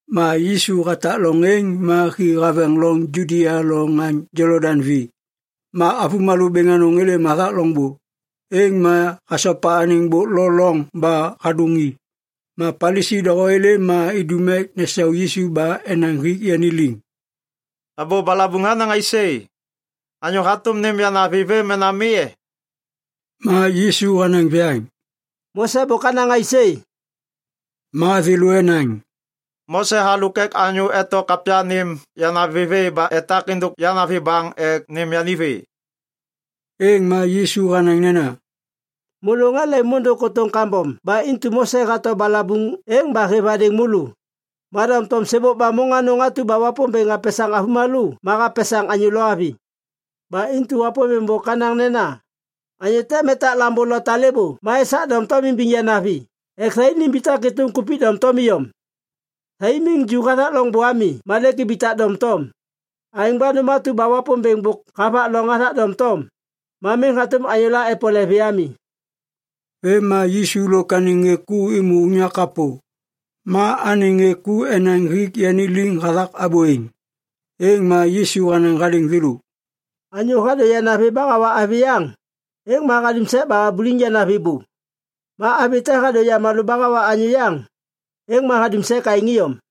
Ma Yisu hatak loŋ êŋ ma hi haveŋ loŋ Judia lo ŋaŋ Jolodaŋ vi. Ma avômalô bêŋ anôŋ êlêm hathak loŋbô. Êŋ ma hasopa anêŋ bôk lo loŋ ba hadôŋ i. Ma Palisi doho êlêm ma idum ek nesau Yisu ba enaŋ hik yani liŋ, “Abô balabuŋ hanaŋ aisê? Anyô hatôm nêm yanavi vê mena mi e?” Ma Yisu hanaŋ viyaŋ, “Mose bôk hanaŋ aisê?” Ma thêlô enaŋ, “Mose halôk ek anyô eto kapya nêm yanavi vê ba etak êndôk yanavi baŋ ek nêm yani vê.” Êŋ ma Yisu hanaŋ nena, “Môlô ŋê lemôndôŋ kôtôŋ kambom ba intu Mose hato balabuŋ êŋ ba hêv hadêŋ môlô. Ma doŋtom ‘sêbôk ba môŋ anôŋ atu ba Wapômbêŋ hapesaŋ avômalô ma hapesaŋ anyô lo avi. Ba intu Wapômbêŋ bôk hanaŋ nena, “Anyô tem etak lambô lo talêbô ma esak doŋtom imbiŋ yanavi ek thai nimbitak êtôm kupik doŋtom iyom.” ’ Thai miŋ ju hathak loŋbô ami ma lêk ibitak doŋtom. Aêŋ ba nôm atu ba Wapômbêŋ bôk havak loŋ hathak doŋtom, ma miŋ hatôm anyôla epole vê ami.” Vêm ma Yisu lôk anêŋ ŋê ku êmô unyak kapô, ma anêŋ ŋê ku enaŋ hik yani liŋ hathak abô êŋ. Êŋ ma Yisu hanaŋ hadêŋ thêlô, “Anyô hadô yanavi ba hawa avi yaŋ, êŋ ma hadum sek ba habuliŋ yanavi bô. Ma avi te hadô yamalô ba hawa anyô yaŋ, êŋ ma hadum sek aêŋ iyom.”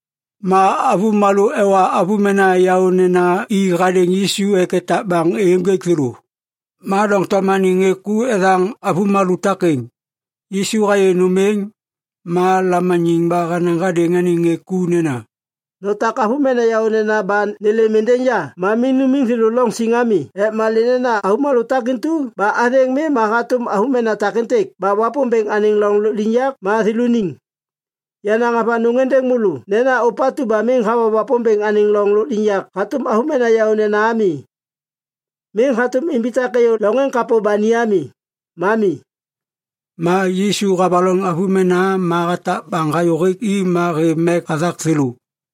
Ma avômalô ewa avômena yaônena i hadêŋ Yisu ek etak baŋ êyô ênjêk thêlô. Ma doŋtom anêŋ ŋê ku ethaŋ avômalô takêŋ. Yisu hayê nôm êŋ, ma lamaniŋ ba hanaŋ hadêŋ anêŋ ŋê ku nena, “Notak avômena yaônena ba nêlêm êndêŋ ya ma miŋ numiŋ thêlô loŋ siŋ ami ek malê nena avômalô takatu ba athêŋ mi ma hatôm avômena takêntêk ba Wapômbêŋ anêŋ loŋ lôkliŋyak ma thêlôniŋ. Yanaŋ avanôŋ êndêŋ môlô nena ôpatu ba miŋ hawa Wapômbêŋ anêŋ loŋ lôkliŋyak hatôm avômena yaônena ami, miŋ hatôm imbitak êyô loŋ êŋ kapô ba ni ami. Ma mi.” Ma Yisu havaloŋ avômena ma hatak baŋ hayô hêk i ma hêv mek hathak thêlô.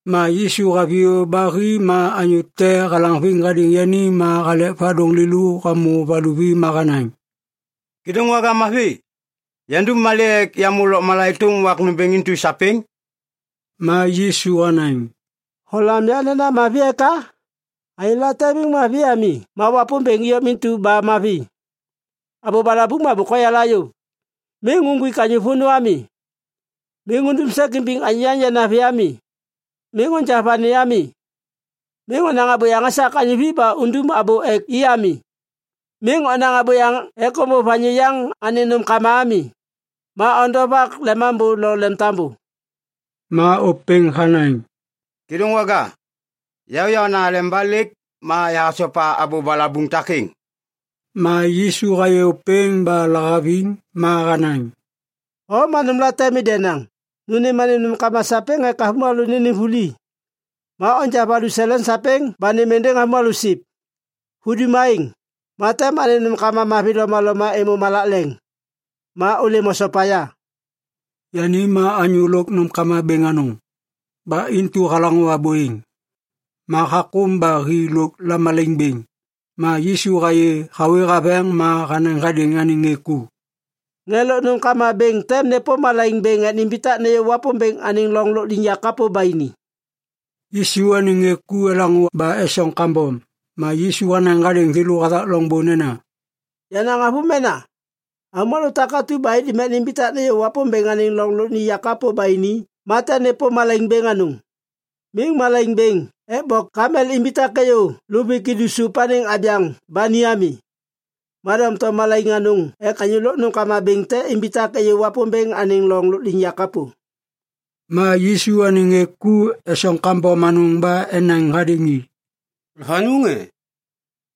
Ma Yisu haviyô ba hi ma anyô te halaŋviŋ hadêŋ yani ma halek vadôŋ lêlô hamô valuvi ma hanaŋ, “Kêdôŋwaga mavi, yandum malê ek yamô lôkmala êtôm wak nômbêŋ intu sapêŋ?” Ma Yisu hanaŋ, “Holam ya nena mavi eka? Anyô late miŋ mavi ami ma Wapômbêŋ iyom intu ba mavi. Abô balabuŋ ma bôk hoyala yôv: ‘Miŋ uŋgwik anyô vônô ami. Miŋ undum sek imbiŋ anyô yaŋ yanavi ami. Miŋ onja vani ami. Miŋ onaŋ abôyaŋ esak anyô vi ba undum abô ek i ami. Miŋ onaŋ abôyaŋ ek ômbôv anyô yaŋ anêŋ nômkama ami. Ma ondovak lemambô lo lemtambô.’” Ma ôpêŋ hanaŋ, “Kêdôŋwaga, ya yaôna aleba lêk ma yahasopa abô balabuŋ takêŋ.” Ma Yisu hayê ôpêŋ ba lahaviŋ. Ma hanaŋ, “O ma nômlate mi denaŋ. Nu nêm anêm nômkama sapêŋ ek avômalô nênêm vuli, ma onja valuseleŋ sapêŋ ba nêm êndêŋ avômalô siv. Hudum aêŋ, ma tem anêm nômkama mavi lomaloma êmô malak leŋ. Ma ôlêm osopa ya.” Yani ma anyô lôk nômkama bêŋ anôŋ. Ba intu halaŋô abô êŋ, ma hakôm ba hi lôk lamalaiŋ bêŋ. Ma Yisu hayê hawê haveŋ ma hanaŋ hadêŋ anêŋ ŋê ku, “Ŋê lôk nômkama bêŋ tem nêpôm malaiŋ bêŋ ek nimbitak nêyô Wapômbêŋ anêŋ loŋ lôkliŋyak kapô ba ini.” Yisu anêŋ ŋê ku elaŋô ba esoŋ kambom. Ma Yisu hanaŋ hadêŋ thêlô hathak loŋbô nena, “Yenaŋ avômena, avômalô takatu ba indum ek nimbitak nêyô Wapômbêŋ anêŋ loŋ lôkliŋyak kapô ba ini ma tem nêpôm malaiŋ bêŋ anôŋ! Miŋ malaiŋ bêŋ ek bok kamel imbitak êyô luvik idu sôp anêŋ abyaŋ ba ni ami, ma doŋtom malaiŋ anôŋ ek anyô lôk nômkama bêŋ te imbitak êyô Wapômbêŋ anêŋ loŋ lôkliŋyak kapô.” Ma Yisu anêŋ ŋê ku esoŋ kambom anôŋ ba enaŋ hadêŋ i, “Avanôŋ e?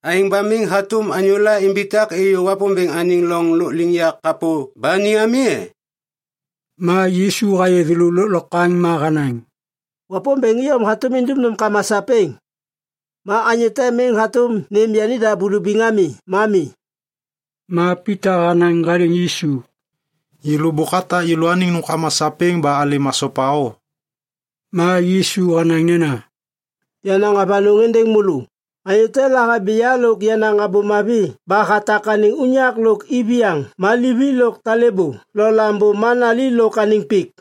Aêŋ ba miŋ hatôm anyôla imbitak êyô Wapômbêŋ anêŋ loŋ lôkliŋyak kapô ba ni ami e?” Ma Yisu hayê thêlô lôklokwaŋ ma hanaŋ, “Wapômbêŋ iyom hatôm indum nômkama sapêŋ. Ma anyô te miŋ hatôm nêm yanida bulubiŋ ami ma mi.” Ma Pita hanaŋ hadêŋ Yisu, “Yêlô bôk atak yêlôaniŋ nômkama sapêŋ ba alêm asopa o!” Ma Yisu hanaŋ nena, “Yanaŋ avanôŋ êndêŋ môlô, anyô te lahabi ya lôk yenaŋ Abô Mavi ba hatak anêŋ unyak lôk iviyaŋ ma livi lôk talêbô lo lambô ma nali lôk anêŋ pik,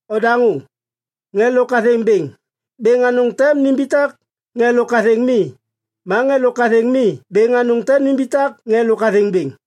Odaŋô! Ŋê lôk athêŋ bêŋ, bêŋ anôŋ tem nimbitak ŋê lôk athêŋ mi. Ma ŋê lôk athêŋ mi bêŋ anôŋ tem nimbitak ŋê lôk athêŋ bêŋ.”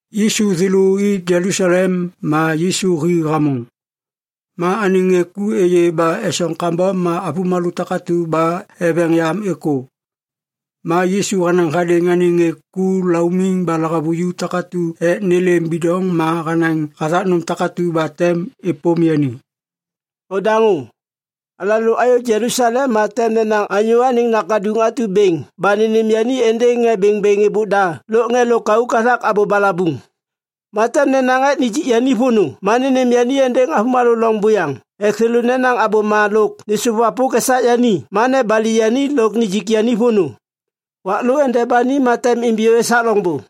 Yisu thêlô i Jelusalem ma Yisu hi hamôŋ. Ma anêŋ ŋê ku êyê ba esoŋ kambom ma avômalô takatu ba eveŋ yam êkô. Ma Yisu hanaŋ hadêŋ anêŋ ŋê ku laumiŋ ba lahavuju takatu ek nêlêm bidoŋ ma hanaŋ hathak nôm takatu ba tem êpôm yani. “Odaŋô. Alalô ayô Jelusalem ma tem nenaŋ Anyô Anêŋ Nakaduŋ atu bêŋ ba nênêm yani êndêŋ ŋê bêŋbêŋ êbôk da lôk ŋê lôkauk hathak abô balabuŋ. Ma tem nenaŋ ek nijik yani vônô ma nênêm yani êndêŋ avômalô loŋ buyaŋ ek thêlô nenaŋ abôma lôk nêsôvwapôk esak yani ma nebali yani lôk nijik yani vônô. Wak lô ende ba ni ma tem imbiyô esak loŋbô.”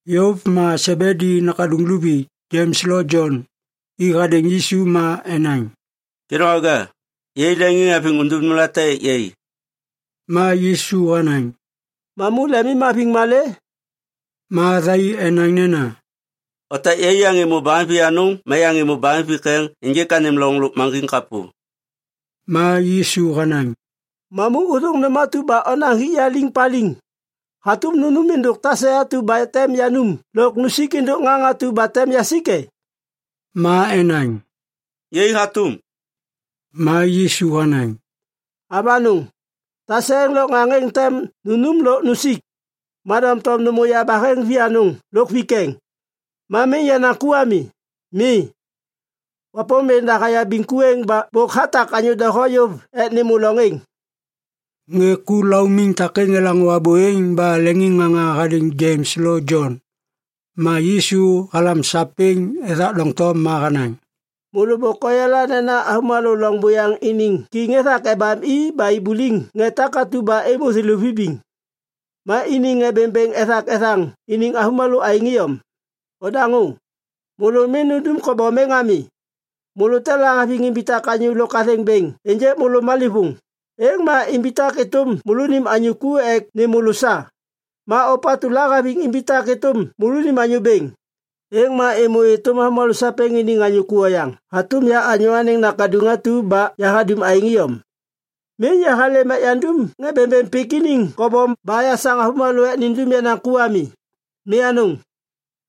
Yôv ma Sebedi nakaduŋ luvi, Jems lo Jon, i hadêŋ Yisu ma enaŋ, “Kêdôŋwaga, yai leŋiŋhaviŋ undum nômlate ek yai.” Ma Yisu hanaŋ, “Mamu lemimhaviŋ malê?” Ma thai enaŋ nena, “Otak yai yaŋ êmô bahem vianôŋ ma yaŋ êmô bahem vikeŋ ênjêk anêm loŋ lôkmaŋgiŋ kapô.” Ma Yisu hanaŋ, “Mamu ôthôŋ nôm atu ba onaŋ hik ya liŋ paliŋ. Hatôm nunum êndôk tase atu ba tem yanum lôk nusik êndôk ŋaŋ atu ba tem yasik e?” Ma enaŋ, “Yai hatôm.” Ma Yisu hanaŋ, “Avanôŋ, tase êŋ lôk ŋaŋ êŋ tem nunum lôk nusik. Ma doŋtom nêmô yabaheŋ vianôŋ lôk vikeŋ, ma miŋ yenaŋ ku ami. Mi, Wapômbêŋ da hayabiŋ ku êŋ ba bôk hatak anyô doho yôv ek nêmô loŋ êŋ.” Ŋê ku laumiŋ takêŋ elaŋô abô êŋ ba leŋiŋŋaŋa hadêŋ Jems lo Jon. Ma Yisu halam sapêŋ ethak doŋtom ma hanaŋ, “Môlô bôk oyala nena avômalô loŋ buyaŋ iniŋ kiŋ ethak ebam i ba ibuliŋ ŋê takatu ba êmô thêlô vibiŋ. Ma iniŋ ŋê bêŋbêŋ ethak ethaŋ iniŋ avômalô aêŋ iyom. Odaŋô! Môlô miŋ nundum kobom êŋ ami! Môlô te lahaviŋ imbitak anyô lôk athêŋ bêŋ ênjêk môlô malêvôŋ, êŋ ma imbitak êtôm môlônim anyô ku ek nêm môlô sa. Ma ôpatu lahaviŋ imbitak êtôm môlônim anyô bêŋ, êŋ ma êmô êtôm avômalô sapêŋ iniŋ anyô ku oyaŋ hatôm ya Anyô Anêŋ Nakaduŋ atu ba yahadum aêŋ iyom. Miŋ yahalêm ek yandum ŋê bêŋbêŋ pik iniŋ kobom ba yasaŋ avômalô ek nindum yenaŋ ku ami. Mi anôŋ!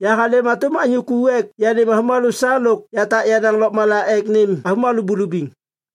Yahalêm hatôm anyô ku ek yanêm avômalô sa lôk yatak yenaŋ lôkmala ek nêm avômalô bulubiŋ.”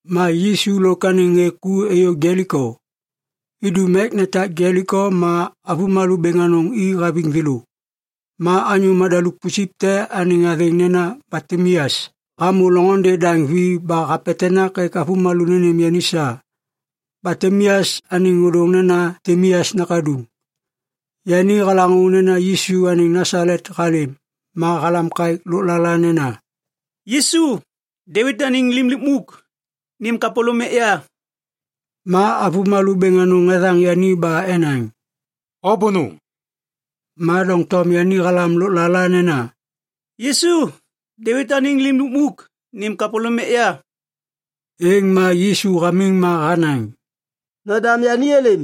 Ma Yisu lôk anêŋ ŋê ku êyô Jeliko. Idum ek netak Jeliko ma avômalô bêŋ anôŋ i haviŋ thêlô. Ma anyô madaluk pusip te anêŋ athêŋ nena Batimeas hamô loŋôndê daŋ vi ba hapetenak ek avômalô nênêm yani sa. (Batimeas anêŋ ôdôŋ nena Timeas nakaduŋ.) Yani halaŋô nena Yisu anêŋ Nasalet halêm, ma halam kaêk lôklala nena, “Yisu, Devit anêŋ Lim Lukmuk, nêm kapôlôm ek ya!” Ma avômalô bêŋ anôŋ ethaŋ yani ba enaŋ, “O bônôŋ!” Ma doŋtom yani halam lôklala nena, “Yisu, Devit anêŋ Lim Lukmuk, nêm kapôlôm ek ya!” Êŋ ma Yisu hamiŋ ma hanaŋ, “Nodam yani êlêm.”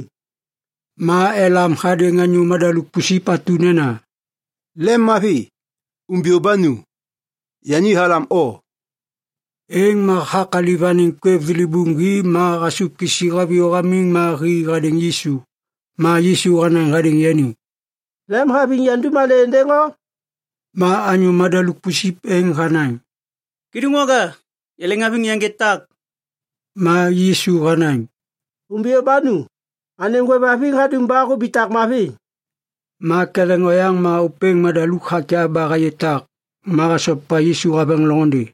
Ma elam hadêŋ anyô madaluk pusip atu nena, “Lemmavi! Umbiyô ba nu! Yani halam o.” Êŋ ma hakaliv anêŋ kwêv thilibuŋ hi ma hasôv kisi haviyô hamiŋ ma hi hadêŋ Yisu. Ma Yisu hanaŋ hadêŋ yani, “Lemhaviŋ yandum malê êndêŋ o?” Ma anyô madaluk pusip êŋ hanaŋ, “Kêdôŋwaga, yaleŋhaviŋ yaŋgê tak.” Ma Yisu hanaŋ, “Umbiyô ba nu. Anêm hôêvhaviŋ hadum ba hubitak mavi.” Ma ketheŋ oyaŋ ma ôpêŋ madaluk hakyav ba hayê tak, ma hasopa Yisu haveŋ loŋôndê.